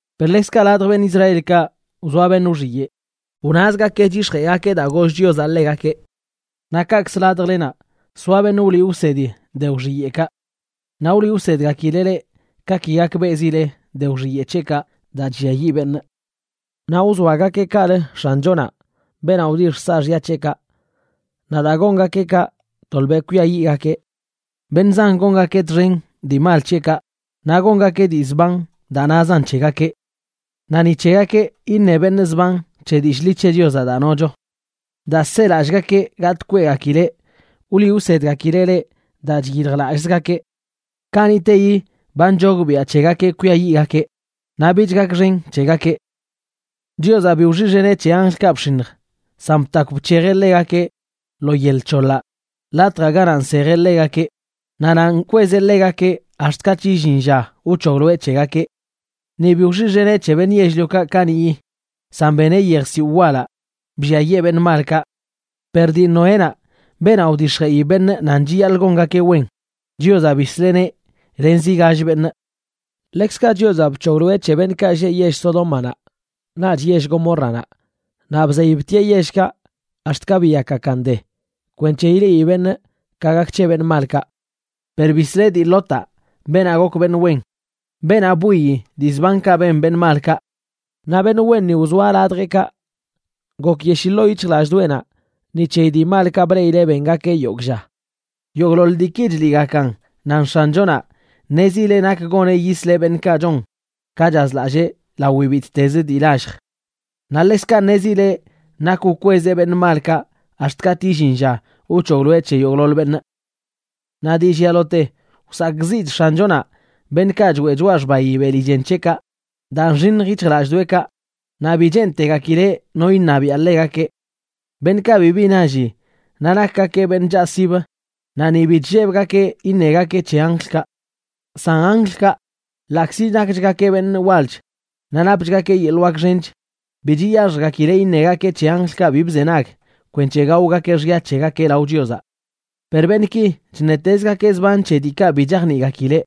Per ḻekzkaꞌ ladj beṉꞌ Israelkaꞌ wzoa beṉꞌ wxiyeꞌ, wnazgakeꞌ chyix̱jeꞌgakeꞌ daa goll Chiozaꞌ ḻegakeꞌ. Naꞌ kaꞌkzə ladjlenaꞌ soa beṉꞌ wliꞌ wsedi de wxiyeꞌkaꞌ. Naꞌ wliꞌ wsedgakileꞌ leꞌ ka ki gakbeꞌzileꞌ de wxiyeꞌ c̱heꞌkaꞌ daa chlliayiꞌ beṉꞌ. Naꞌ wzoagakeꞌ kaꞌlə X̱anchonaꞌ, beenaꞌ wdixj saaxya c̱heꞌkaꞌ. Naꞌ daa gongakeꞌ kaꞌ, tolbeꞌ kwiayiꞌgakeꞌ. Beṉꞌ zan gongakeꞌ txen dii mal c̱heꞌkaꞌ naꞌ gongakeꞌ dii zban daa nazan c̱hegakeꞌ. Naꞌ ni c̱hegakeꞌ iṉe beṉꞌ zban c̱he dillꞌ ḻi c̱he Chiozaꞌ daa nocho. Daa selallꞌgakeꞌ gatꞌ kweꞌgakileꞌ, wliꞌ wsedgakileꞌ leꞌ daa chyiljlallꞌzgakeꞌ. Kaniꞌteyi ba nchogbiaꞌ c̱hegakeꞌ kwiayiꞌgakeꞌ, naꞌ bich gakxen c̱hegakeꞌ. Chiozaꞌ bi wxiꞌxeneꞌ c̱he anjlkaꞌ bx̱iṉj, san btakw bc̱hejeꞌ ḻegakeꞌ lo yel c̱hoḻaꞌ latjaꞌ ganaꞌ nsejeꞌ ḻegakeꞌ, naꞌ nanꞌ nkwezeꞌ ḻegakeꞌ ax̱t katꞌ illin lla wc̱hogloeꞌ c̱hegakeꞌ. Ni bi wxiꞌxeneꞌ c̱he beṉꞌ yell-liokaꞌ kaniꞌyi, san beneꞌ yejsiwꞌ walaꞌ blliayee beṉꞌ malkaꞌ. Per dii Noénaꞌ, beenaꞌ wdix̱jeꞌi beṉꞌ nan chiyaḻꞌ gongakeꞌ wen, Chiozaꞌ bisleꞌneꞌ len zi gall beṉꞌ. Ḻekzkaꞌ Chiozaꞌ bc̱hogloeꞌ c̱he beṉꞌkaꞌ lleꞌ yell Sodómanaꞌ naꞌch yell Gomórranaꞌ, naꞌ bzey btieꞌ yellkaꞌ ax̱t ka biyakgakan de, kwenc̱he ileꞌi beṉꞌ ka gak c̱he beṉꞌ malkaꞌ. Per bisleꞌ dii Lotaꞌ, beenaꞌ gok beṉꞌ wen, beenaꞌ bwiyi dii zbankaꞌ ben beṉꞌ malkaꞌ. Naꞌ beṉꞌ wenni wzoa ladjeꞌkaꞌ, gokyeshii ḻoo yic̱hjlallꞌdoꞌenaꞌ ni c̱heyi dii malkaꞌ bleꞌileꞌ bengakeꞌ yogꞌ lla. Yogꞌḻoḻ diiki chliꞌgakan nan X̱anchonaꞌ ṉezileꞌ nak goneꞌ yisleꞌ beṉꞌkaꞌ chon ka chazlallee lawi bittezə dii lallj. Naꞌ ḻekzkaꞌ ṉezileꞌ nak wkwezeꞌ beṉꞌ malkaꞌ ax̱t katꞌ illin lla wc̱hogloeꞌ c̱he yogꞌḻoḻ beṉꞌ. Naꞌ dii llialote wsakꞌziꞌch X̱anchonaꞌ beṉꞌkaꞌ choeꞌ choꞌa xbayi beli chen c̱heꞌkaꞌ daa nxiṉj yic̱hjlallꞌdoꞌekaꞌ, naꞌ bi cheentegakileꞌ no iṉabiaꞌ ḻegakeꞌ. Beṉꞌkaꞌ bibi nalli naꞌ nakgakeꞌ beṉꞌ chaꞌsib, naꞌ ni bi chllebgakeꞌ iṉegakeꞌ c̱he anjlkaꞌ. San anjlkaꞌ, ḻaꞌkzi nakchgakeꞌ beṉꞌ walch naꞌ napchgakeꞌ yeḻꞌ wak xench, bi chiyaxjgakileꞌ iṉegakeꞌ c̱he anjlkaꞌ bi bzenag kwenc̱he gaogakeꞌ xya c̱hegakeꞌ lao Chiozaꞌ. Per beṉꞌki chṉetezgakeꞌ zban c̱he diikaꞌ bi chajniꞌgakileꞌ.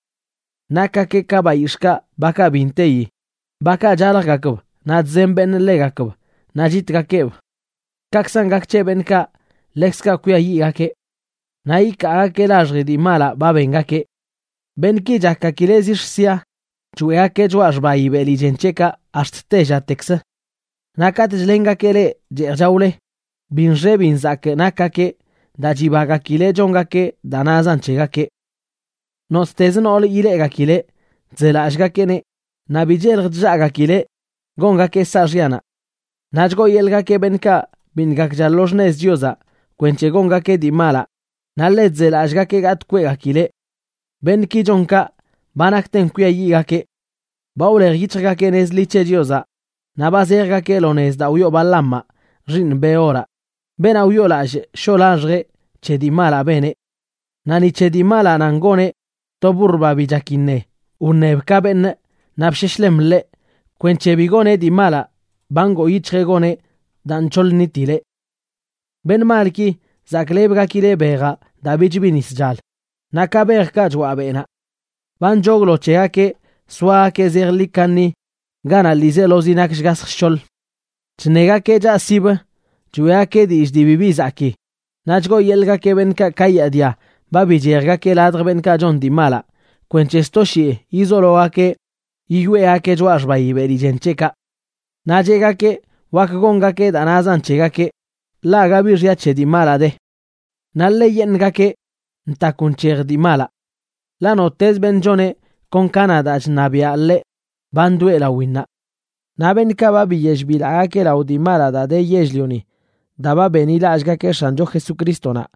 Nakgakeꞌ ka bayix̱ꞌkaꞌ bakaꞌ bi nteyi, bakaꞌ chaljgakb naꞌ chzen beṉꞌ ḻegakb naꞌ chitgakeꞌb. Kaꞌkzan gak c̱he beṉꞌkaꞌ, ḻekzkaꞌ kwiayiꞌgakeꞌ. Naꞌ ikaagakeꞌ laxji dii malaꞌ ba bengakeꞌ. Beṉꞌki chakgakileꞌ zix̱ sia choeꞌgakeꞌ choꞌa xbayi beli chen c̱heꞌkaꞌ ax̱t tellatekzə. Naꞌ katꞌ chlengakeꞌ leꞌ cheej chaole, bi nxe bi nzakꞌ nakgakeꞌ daa chibagakileꞌ chongakeꞌ daa nazan c̱hegakeꞌ. Nottezə noolə ileꞌgakileꞌ chzelallꞌgakeꞌneꞌ, naꞌ bi chelj chllaꞌgakileꞌ gongakeꞌ saaxyanaꞌ. Naꞌ chgooyeḻꞌgakeꞌ beṉꞌkaꞌ biṉꞌ gakcha lo xṉez Chiozaꞌ kwenc̱he gongakeꞌ dii malaꞌ, naꞌ ḻe chzelallꞌgakeꞌ gatꞌ kweꞌgakileꞌ. Beṉꞌki chon kaꞌ ba nakten kwiayiꞌgakeꞌ. Ba wlej yic̱hjgakeꞌ nez ḻi c̱he Chiozaꞌ naꞌ ba zejgakeꞌ lo nez daa wyoo Balaamaꞌ xiiṉ Beoraꞌ, beenaꞌ wyoolallꞌ shoꞌ laxjeꞌ c̱he dii malaꞌ beneꞌ. Naꞌ ni c̱he dii malaꞌ nan goneꞌ, to burr, ba bi chak iṉe, wṉeb ka beṉꞌ naꞌ bsheshlem ḻeꞌ kwenc̱he bi goneꞌ dii malaꞌ ba ngoo yic̱hjeꞌ goneꞌ daa nc̱hoḻ nitileꞌ. Beṉꞌ malki zaklebgakileꞌ bejaꞌ daa bich bi nis chal, naꞌ ka bejkaꞌ choaꞌ beꞌnaꞌ. Ba nchoglo c̱hegakeꞌ soagakeꞌ zejḻi kaṉi ganaꞌ ḻiizelozi nak shgasj shc̱hoḻ. Chṉegakeꞌ chaꞌsibə choeꞌgakeꞌ dillꞌ dii bibi zakii, naꞌ chgooyeḻꞌgakeꞌ beṉꞌkaꞌ kayaadia ba bichejgakeꞌ ladj beṉꞌkaꞌ chon dii malaꞌ kwenc̱he sto shii yizologakeꞌ yiyoeꞌgakeꞌ choꞌa xbayi beli chen c̱heꞌkaꞌ. Naꞌ cheꞌgakeꞌ wak gongakeꞌ daa nazan c̱hegakeꞌ, ḻaꞌ aga bi xya c̱he dii malaꞌ de, naꞌ ḻeꞌyeṉꞌgakenꞌ ntakw nc̱hej dii malaꞌ. Ḻaꞌ nottezə beṉꞌ choneꞌ kon ka na daa chṉabiaꞌ ḻeꞌ, ba ndoꞌe lawinnaꞌ. Naꞌ beṉꞌkaꞌ ba biyell bilaꞌgakeꞌ lao dii malaꞌ daa de yell-lioni daa ba benḻilallꞌgakeꞌ X̱ancho Jesucrístonaꞌ,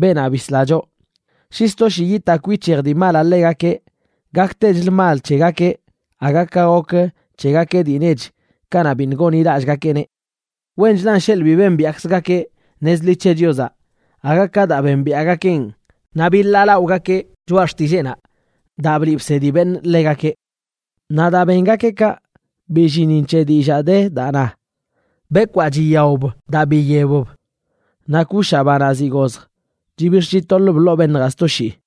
beenaꞌ bisla choꞌ, shi sto shii yitakw yic̱hej dii malaꞌ ḻegakeꞌ, gaktechlə mal c̱hegakeꞌ aga ka gok c̱hegakeꞌ dii nech kanaꞌ biṉꞌ gonḻilallꞌgakeꞌneꞌ. Wenchlan sheḻꞌ bi bembiaꞌkzgakeꞌ nez ḻi c̱he Chiozaꞌ aga ka daa bembiaꞌgakeꞌn naꞌ biḻaalaꞌogakeꞌ choꞌa xtilleenaꞌ daa bliꞌ bsedi beṉꞌ ḻegakeꞌ. Naꞌ daa bengakeꞌ kaꞌ, billinin c̱he dillaa de daa na: “Bekwaa chiyaob daa biyebb, naꞌ kushaꞌ, banaꞌ ziꞌ gozj, chibix̱ chitoḻb ḻoo beṉjaꞌ sto shii.”